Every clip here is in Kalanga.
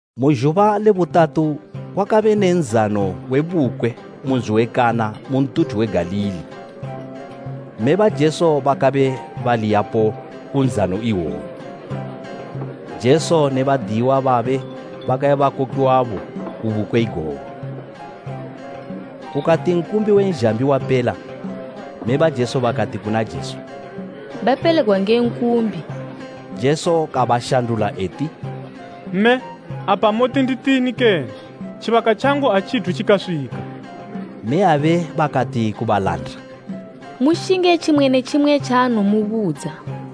Mu zhuba le butatu kwakabe ne nzano we bukwe mu nzi we Kana mu ntuthu we Galili. Mme ba Jesu bakabe bali yapo ku nzano iwoyo. Jesu ne badiyiwa babe bakabe bakokiwabo ku bukwe igogo. Kukati nkumbi we zhambi wapela, mme ba Jesu bakati kuna Jesu, “Bapelegwa nge nkumbi.” Jesu kabashandula eti, “Mme, apa moti nditini kene? Tjibaka tjangu atjithu tjikaswika.” Mmeyabe bakati ku balanda, “Mushinge tjimwe ne tjimwe tjaanowomubudza.”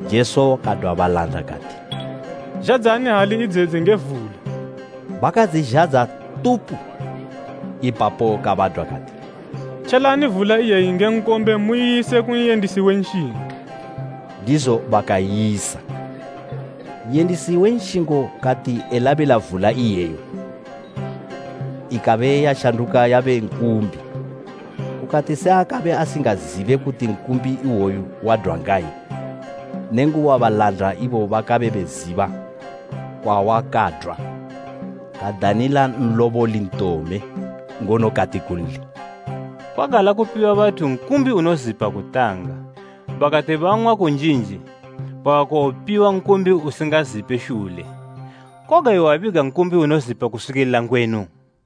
Jesu kadwa balanda kati, “Zhadzani hali idzedzi nge vula.” Bakadzizhadza tupu! Ipapo kabadwa kati, “Tjelani vula iyeyi nge nkombe muyise ku n'yendisi we nshingo.” Ndizo bakaiyisa. N'yendisi we nshingo kati elabila vula iyeyo, ikabe yashanduka yabe nkumbi. Kukati se akabe asingazibe kuti nkumbi iwoyu wadwa ngayi, nenguba balanda ibo bakabe beziba kwawakadwa, kadanila nloboli ntome ngono kati kunli, “Kwagala kupiwa bathu nkumbi unozipa kutanga, bakati bang'wa kunjinji bakakowopiwa nkumbi usingazipe shule. Koga iwe wabiga nkumbi unozipa kuswikila ngwenu!”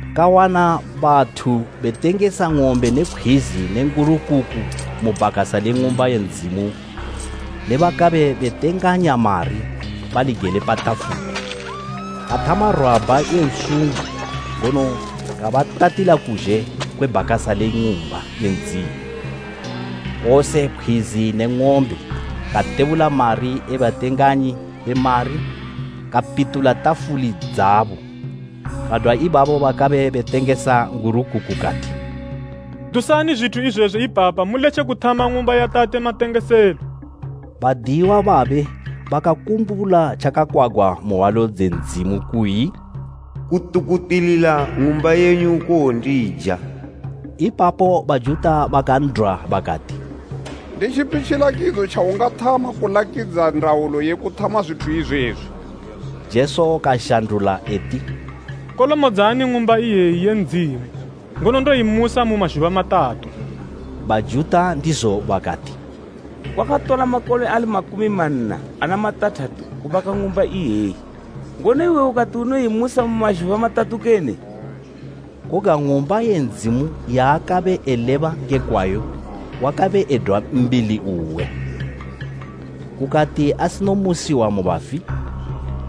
Kawana bathu betengesa ng'ombe ne pkhwizi ne ngurukuku mu bhakasa le Ng'umba ye Ndzimu ne bakabe betenganya mari bali gele pa tafuli. Kathama rwabha ye nsungo ngono kabatatila kuzhe kwe bhakasa le Ng'umba ye Ndzimu, kose pkhwizi ne ng'ombe, katebula mari e batenganyi be mari kapitula tafuli dzabo. Kadwa ibabo bakabe betengesa ngurukuku kati, “Dusani zwithu izwezwi ipapa muletje kuthama Ng'umba ya Tate matengeselo!” Badiyiwa babe bakakumbula tjakakwagwa mu hwalo dze Ndzimu kuyi, “Kutukutilila ng'umba yenyu kowondija.” Ipapo Bajuta bakan'dwa bakati, “Nditjipi tjilakidzo tjaungathama kulakidza ndaulo ye kuthama zwithu izwezwi?” Jesu kashandula eti, “Kolomodzani Ng'umba iyeyi ye Ndzimu, ngono ndoyimusa mu mazhuba matatu.” Bajuta ndizo bakati, “Kwakatola makole ali makumi manna ana matathatu kubaka Ng'umba iyeyi, ngono iwe ukati unowoyimusa mu mazhuba matatu kene?” Koga Ng'umba ye Ndzimu yaakabe eleba nge kwayo wakabe edwa mbili uwe. Kukati asinomusiwa mu bafi,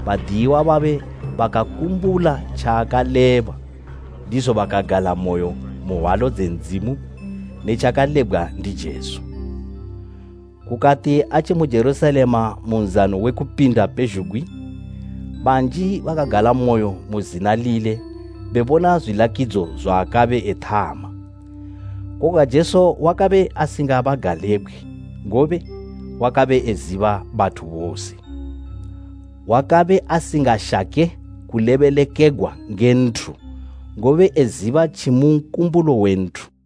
badiyiwa babe bakakumbula tjaakaleba, ndizo bakagalamoyo mu hwalo dze Ndzimu ne tjakalebgwa ndi Jesu. Kukati atjimu Jerusalema mu Nzano we Kupinda pezhugwi, banji bakagalamoyo mu zina lile bebona zwilakidzo zwaakabe ethama. Koga Jesu wakabe asingabagalebgwe ngobe wakabe eziba bathu bose. Wakabe asingashake kulebelekegwa nge nthu, ngobe eziba tjimu nkumbulo we nthu.